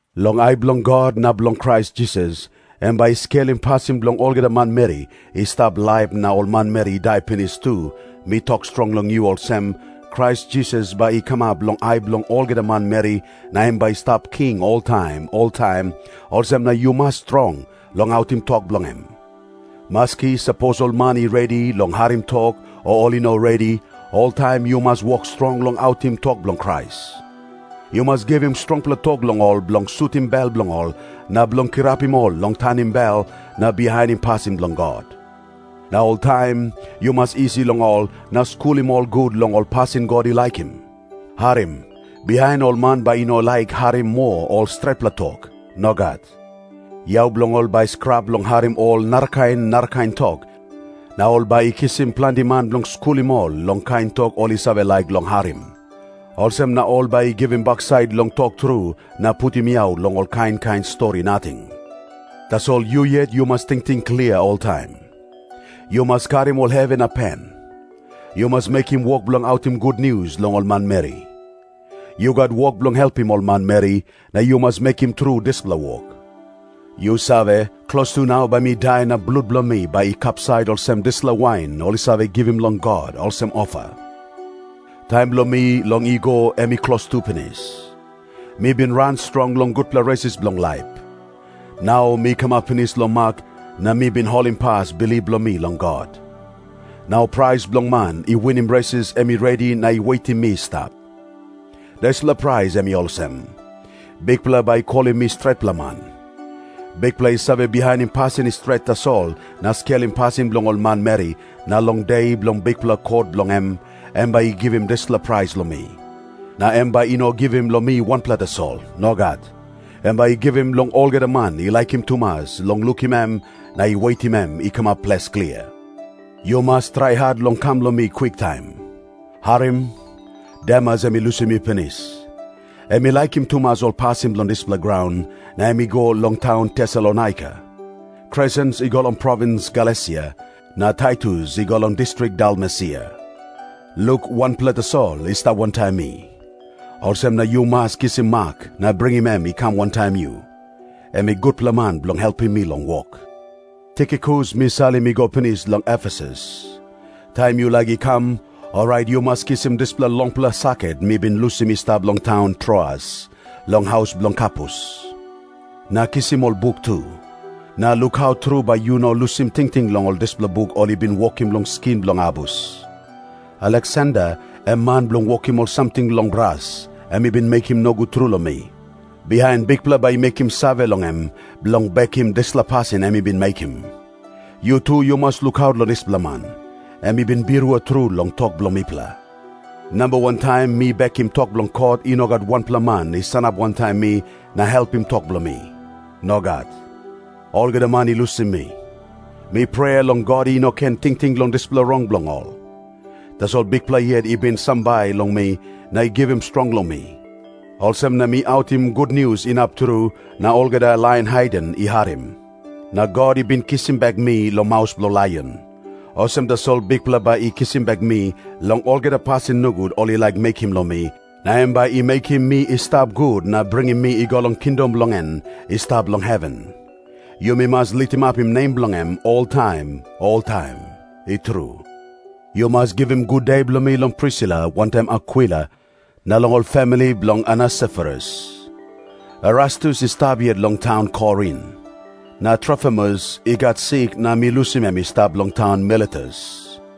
Long ai bilong God na bilong Krais Jisas, em bai i skelim pasin bilong olgeta manmeri i stap laip na ol manmeri i dai pinis tu, mi tok strong long yu olsem, Krais Jisas bai i kamap long ai bilong olgeta manmeri na em bai i stap king oltaim oltaim, olsem na yu mas strong long autim tok bilong em. Maski sapos ol man i redi long harim tok o ol i no redi, oltaim yu mas wok strong long autim tok bilong Krais. Yu mas givim strongpela tok long ol bilong sutim bel bilong ol na bilong kirapim ol long tanim bel na bihainim pasin bilong God. Na oltaim yu mas isi long ol na skulim ol gut long ol pasin God i laikim. Harim. Bihain ol man bai i no laik harim moa ol stretpela tok. Nogat. Yau bilong ol bai i skrap long harim ol narakain narakain tok, na ol bai i kisim planti man bilong skulim ol long kain tok ol i save laik long harim. Olsem na ol bai i givim baksait long tok tru na putim yau long ol kain kain stori nating. Tasol yu yet yu mas tingting klia oltaim. Yu mas karim ol hevi na pen. Yu mas mekim wok bilong autim gutnius long ol manmeri. Yu gat wok bilong helpim ol manmeri, na yu mas mekim tru dispela wok. Yu save, klostu nau bai mi dai na blut bilong mi bai i kapsait olsem dispela wain ol i save givim long God olsem ofa. Taim bilong mi long i go em i klostu pinis. Mi bin ran strong long gutpela resis bilong laip. Nau mi kamap pinis long mak, na mi bin holimpas bilip bilong mi long God. Nau prais bilong man i winim resis em i redi na i wetim mi i stap. Dispela prais em i olsem. Bikpela bai i kolim mi stretpela man. Bikpela i save bihainim pasin i stret tasol na skelim pasin bilong ol manmeri, na long De bilong bikpela kot bilong em, em bai i givim dispela prais long mi. Na em bai i no givim long mi wanpela tasol. Nogat. Em bai i givim long olgeta man i laikim tumas long lukim em na i wetim em i kamap ples klia. Yu mas trai hat long kam long mi kwiktaim. Harim. Demas em i lusim mi pinis. Em i laikim tumas ol pasin bilong dispela graun, na em i go long taun Tesalonaika. Kresens i go long provins Galesia, na Taitus i go long distrik Dalmesia. Luk wanpela tasol i stap wantaim mi. Olsem na yu mas kisim Mak na bringim em i kam wantaim yu. Em i gutpela man bilong helpim mi long wok. Tikikus mi salim i go pinis long Efesus. Taim yu laik i kam, orait yu mas kisim dispela longpela saket mi bin lusim i stap long taun Troas, long haus bilong Karpus. Na kisim ol buk tu. Na lukaut tru bai yu no lusim tingting long ol dispela buk ol i bin wokim long skin bilong abus. Aleksander, em man bilong wokim ol samting long bras, em i bin mekim nogut tru long mi. Bihain Bikpela bai i mekim save long em, bilong bekim dispela pasin em i bin mekim. Yu tu yu mas lukaut long dispela man. Em i bin birua tru long tok bilong mipela. Namba wan taim mi bekim tok bilong kot i no gat wanpela man i sanap wantaim mi na helpim tok bilong mi. Nogat. Olgeta man i lusim mi. Mi prea long God i no ken tingting long dispela rong bilong ol. Tasol Bikpela yet i bin sambai long mi na givim strong long mi. Olsem na mi autim gutnius inap tru, na olgeta lain haiden i harim. Na God i bin kisim bek mi long maus bilong laion. Olsem tasol Bikpela bai i kisim bek mi long olgeta pasin nogut ol i laik mekim long mi, na em bai i mekim mi i stap gut na bringim mi i go long kingdom bilong en i stap long heven. Yumi mas litimapim nem bilong em oltaim oltaim. I tru. Yu mas givim gude bilong mi long Prisila wantaim Akwila, na long ol famili bilong Onesiforus. Erastus i stap yet long taun Korin. Na Trofimus i gat sik na mi lusim em i stap long taun Miletus.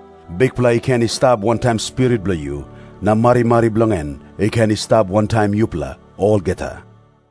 Bikpela i ken i stap wantaim spirit bilong yu. Na marimari bilong en i ken i stap wantaim yupela olgeta.